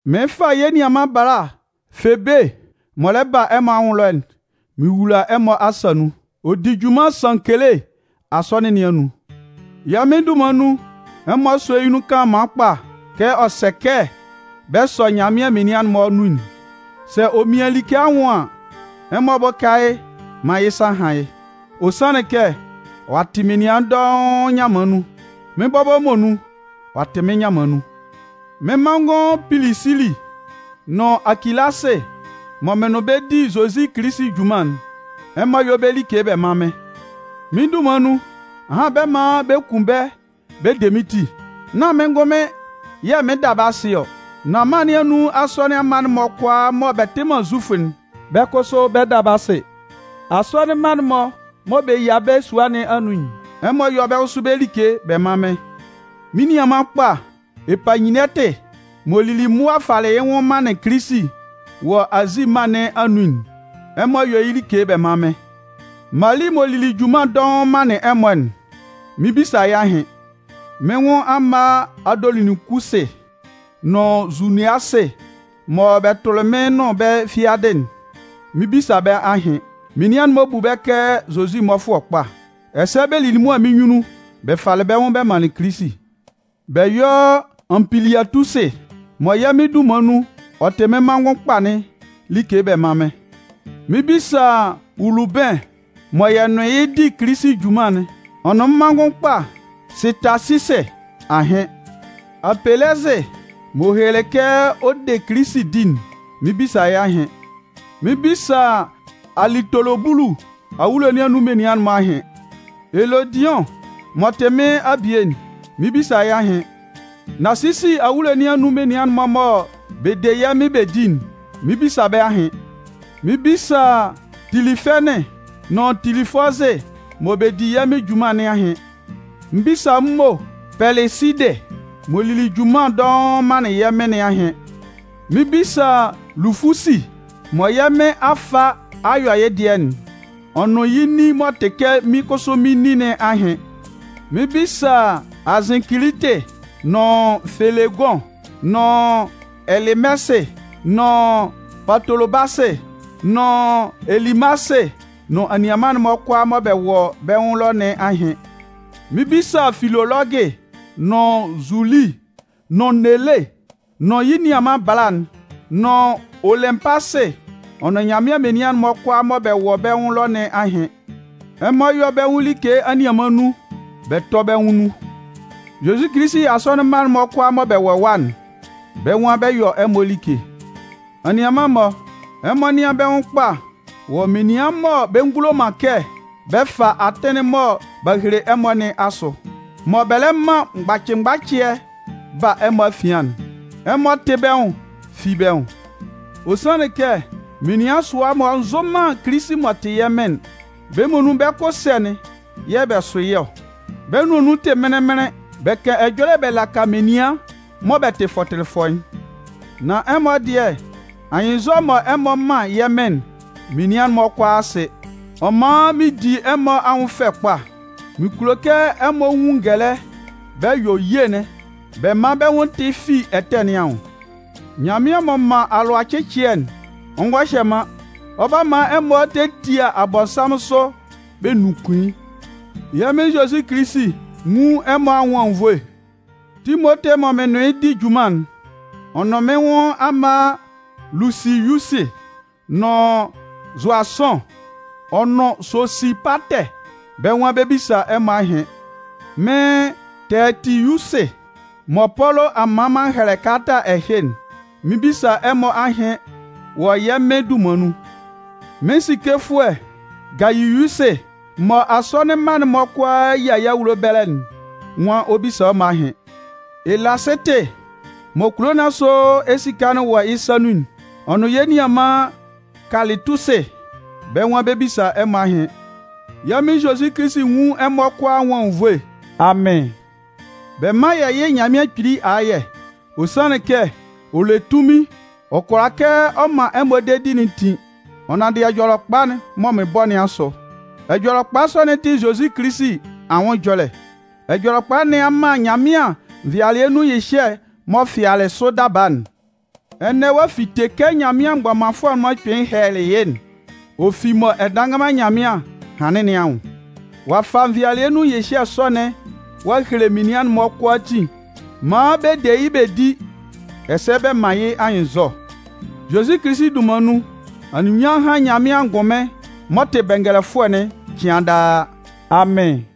Mɩɩn fa yɛ́ nianman bala Febe m'ɔ lɛ ba ɛmɔ anwʋn ɛlɔ'n, mɩn wula ɛmɔ asa nun. Ɔ di junman Sankele asɔnɩn nɩn anun. Yɛ́ Mɩn dunman nun, ɛmɔ sɔ́ yɩ́ nun kanlanman kpa kɛ ɔ sɛ kɛ bɛ sɔ Nyanmɩan menian'n-mɔ nun'n. Sɛ ɔ mian like nwʋn an, ɛmɔ bʋ́ka yɩ́ maan yɩ́ sa hán yɩ́. Ɔ sanlɩn kɛ, ɔ'a tɩ menian dɔʋn nyanman nun. Mɩ́n bɔbɔ muonun, ɔ'a tɩ mɩ́n nyanman nun. Mɩ́n manngʋn Pilisili nʋn Akilasɩ mɔ mɩn nʋn bɛ́ di Zozi Kilisi junman'n, ɛmɔ yɔ́ bɛ́ like bɛ mán mɩ́n. Mɩ́n dunman nun, ahan bɛ 'man bɛ kun bɛ́ bɛ de mɩ́n ti. Nán mɩ́n ngʋnmɩn yɛ̂ mɩn 'da bɛ́ asɩ ɔ, nan mân nɩn anun asɔnɩn mma'n-mɔ kʋalaa mɔ bɛ tɩ man Zufʋ'n, bɛ́ kʋsʋ bɛ 'da bɛ́ asɩ. Asɔnɩn mma'n-mɔ mɔ bɛ yia bɛ́ sua nɩn anun'n, ɛmɔ yɔ́ bɛ́ kʋsʋ bɛ́ like bɛ mán mɩ́n. Mɩ́n nianman kpa Epayinɛtɩ m'ɔ lili mʋa falɩ yɩ́ nwʋn manlɩn Kilisi wɔ Azi mân nɩn anun'n, ɛmɔ yɔ́ yɩ́ like bɛ mán mɩ́n. Mali m'ɔ lili junman dɔʋn manlɩn ɛmɔ'n, mɩn 'bisa yɩ́ ahɩn. Mɩ́n nwʋn amma Andoloninkusɩ nʋn Zuniasɩ mɔ bɛ tʋlɩ mɩ́n nʋn bɛ́ fiadɩ'n, mɩn 'bisa bɛ́ ahɩn. Menian'n-mɔ bu bɛ́ kɛ Zozi mmɔfʋɛ kpa. Ɛsɛ bɛ lili mʋa mɩ́n nyunnun bɛ falɩ bɛ́ nwʋn bɛ manlɩn Kilisi. Bɛ yɔ́ Anpiliatusɩ mɔ yɛ́ Mɩn dunman nun ɔ tɩ mɩ́n manngʋn kpa'n like bɛ mán mɩ́n. Mɩn 'bisa Ulubɩn mɔ yɛ nʋn yɩ́ di Kilisi junman'n ɔ nʋn mɩ́n manngʋn kpa Sɩtasisɩ ahɩn. Apɛlɛsɩ m'ɔ helelɩ kɛ ɔ de Kilisi di'n, mɩn 'bisa yɩ́ ahɩn. Mɩn 'bisa Alitolobulu awulo nɩn anun menian'n-mɔ ahɩn. Elodiʋn m'ɔ tɩ mɩ́n abie'n, mɩn 'bisa yɩ́ ahɩn. Nasisi awulo nɩn anun menian'n-mɔ mɔ bɛ de yɛ̂ Mɩn bɛ di'n, mɩn 'bisa bɛ́ ahɩn. Mɩn 'bisa Tilifɛnɩn nʋn Tilifɔzɩ mɔ bɛ di yɛ́ Mɩn junman nɩn ahɩn. Mɩn 'bisa m mo Pɛlɩsidɩ m'ɔ lili junman dɔʋn manlɩn yɛ́ Mɩn nɩn ahɩn. Mɩn 'bisa Lufusi mɔ yɛ́ Mɩn a fa a yɔ yɩ́ dɩɛ'n, ɔ nʋn yɩ́ nin m'ɔ tɩ kɛ mɩ́n kʋsʋ mɩn nin nɩn ahɩn. Mɩn 'bisa Azɩnkilitɩ nʋn Felegʋn nʋn Ɛlɩmɛsɩ, nʋn Patolobasɩ, nʋn Ɛlɩmasɩ nʋn anianman'n-mɔ kʋalaa mɔ bɛ wɔ bɛ́ nwʋn ɛlɔ nɩn ahɩn. Mɩn 'bisa Filolɔgɩ nʋn Zuli nʋn Nele nʋn yɩ́ nianman bala'n nʋn Olɩnpasɩ ɔ nʋn Nyanmɩan menian'n-mɔ kʋalaa mɔ bɛ wɔ bɛ́ nwʋn ɛlɔ nɩn ahɩn. Ɛmɔ yɔ́ bɛ́ nwʋn like anianman nun, bɛ tɔ́ bɛ́ nwʋn nun. Zozi Kilisi asɔnɩn mma'n-mɔ kʋalaa mɔ bɛ wɔ ɛwa'n, bɛ́ nwan bɛ 'yɔ ɛmɔ like. Anianman-mɔ, ɛmɔ nɩ́an bɛ́ nwʋn kpa wɔ menian mɔ bɛ ngulo man kɛ bɛ fa atɩn'n mɔ b'a hele ɛmɔ nɩn asʋ, mɔ bɛ lɛ man mgbacɩ mgbacɩɛ ba ɛmɔ afian'n. Ɛmɔ tɩ́ bɛ́ nwʋn fi bɛ́ nwʋn. Ɔ sanlɩn kɛ menian sʋa-mɔ nzʋ man Kilisi m'ɔ tɩ yɛ́ Mɩn'n. Bɛ́ muonun bɛ́ kʋ ɛsɛ̂'n yɛ̂ bɛ sʋ yɩ́ ɔ. Bɛ́ nʋan nun tɩ mɩnlɩn mɩnlɩn. Bɛ kan ɛjɔlɛ bɛ laka menian mɔ bɛ tɩ fɔtɩlɩfɔ'n. Nan ɛmɔ dɩɛ, anyɩnnzɔ mɔ ɛmɔ man yɛ́ Mɩn'n, menian'n-mɔ kʋalaa sɩ. Ɔ man mɩn di ɛmɔ anwʋn fɛ kpa. Mɩn kulo kɛ ɛmɔ nwun ngɛlɛ bɛ yɔ ye'n bɛ man bɛ́ nwʋn tɩ fi ɛtɛ nɩn anwʋn. Nyanmɩan m'ɔ man alʋacɩcɩɛ'n, ɔ ngɔ hyɛ man, ɔ 'ba man ɛmɔ tetia Abɔnsanmʋn sʋ bɛ nunkun yɩ́. Yɛ́ Mɩn Zozi Kilisi nwún ɛmɔ anwʋn anwunnvoe. Timote mɔ mɩn nʋn yɩ́ di junman'n, ɔ nʋn mɩ́n nwʋn amma Lusiyusɩ nʋn Zʋasʋn, ɔ nʋn Sosipatɛ, bɛ́ nwan bɛ 'bisa ɛmɔ ahɩn. Mɩ́n Tɛɛtiyusɩ mɔ Pɔlʋ a man m'an hɛlɛ kalata ɛhɩ'n, mɩn 'bisa ɛmɔ ahɩn wɔ yɛ́ Mɩn dunman nun. Mɩ́n sikefʋɛ Gayiyusɩ mɔ asɔnɩn mma'n-mɔ kʋalaa yia yɩ́ awulo ɛbɛlɛ'n nwan ɔ 'bisa ɛmɔ ahɩn. Elasɩtɩ mɔ kulo nɩn asʋ esika'n wɔ yɩ́ sa nun'n, ɔ nʋn yɛ́ nianman Kalɩtusɩ, bɛ́ nwan bɛ 'bisa ɛmɔ ahɩn. [ Yɛ́ Mɩn Zozi Kilisi nwún ɛmɔ kʋalaa anwʋn anwunnvoe. Amɩn.] Bɛ mán yɛ́ yɩ́ Nyanmɩan Kpili ayɛ. Ɔ sanlɩn kɛ ɔ le tunmin ɔ kʋalaa kɛ ɔ man ɛmɔ dedi'n tin, ɔ nanndɩ Ɛjɔlɛkpa'n mɔ mɩn bɔ nɩn asʋ. Ɛjɔlɛkpa sɔ'n tɩ Zozi Kilisi anwʋn ɛjɔlɛ. Ɛjɔlɛkpa nɩn a man Nyanmɩan nvɩalɩɛ nun nyɩhyɛ m'ɔ fɩalɩ sʋ daba'n, ɛnɛ ɔ'a fite kɛ Nyanmɩan mgbɔmanfʋɛ'n-mɔ kpɩnlɩn hɛlɛlɩ yɩ́'n, ɔ fi mɔ Ɛdannganman Nyanmɩan hanlɩn nɩn anwʋn. Ɔ'a fa nvɩalɩɛ nun nyɩhyɛ sɔ'n ɔ'a hele menian'n-mɔ kʋalaatin maan bɛ de yɩ́ bɛ di, ɛsɛ bɛ man yɩ́ anyɩnnzɔ. Zozi Kilisi dunman nun, anunminnyanmʋn hán Nyanmɩan angʋnmɩn m'ɔ tɩ Bɛngɛlɛfʋɛ'n cɩan daa! Amɩn.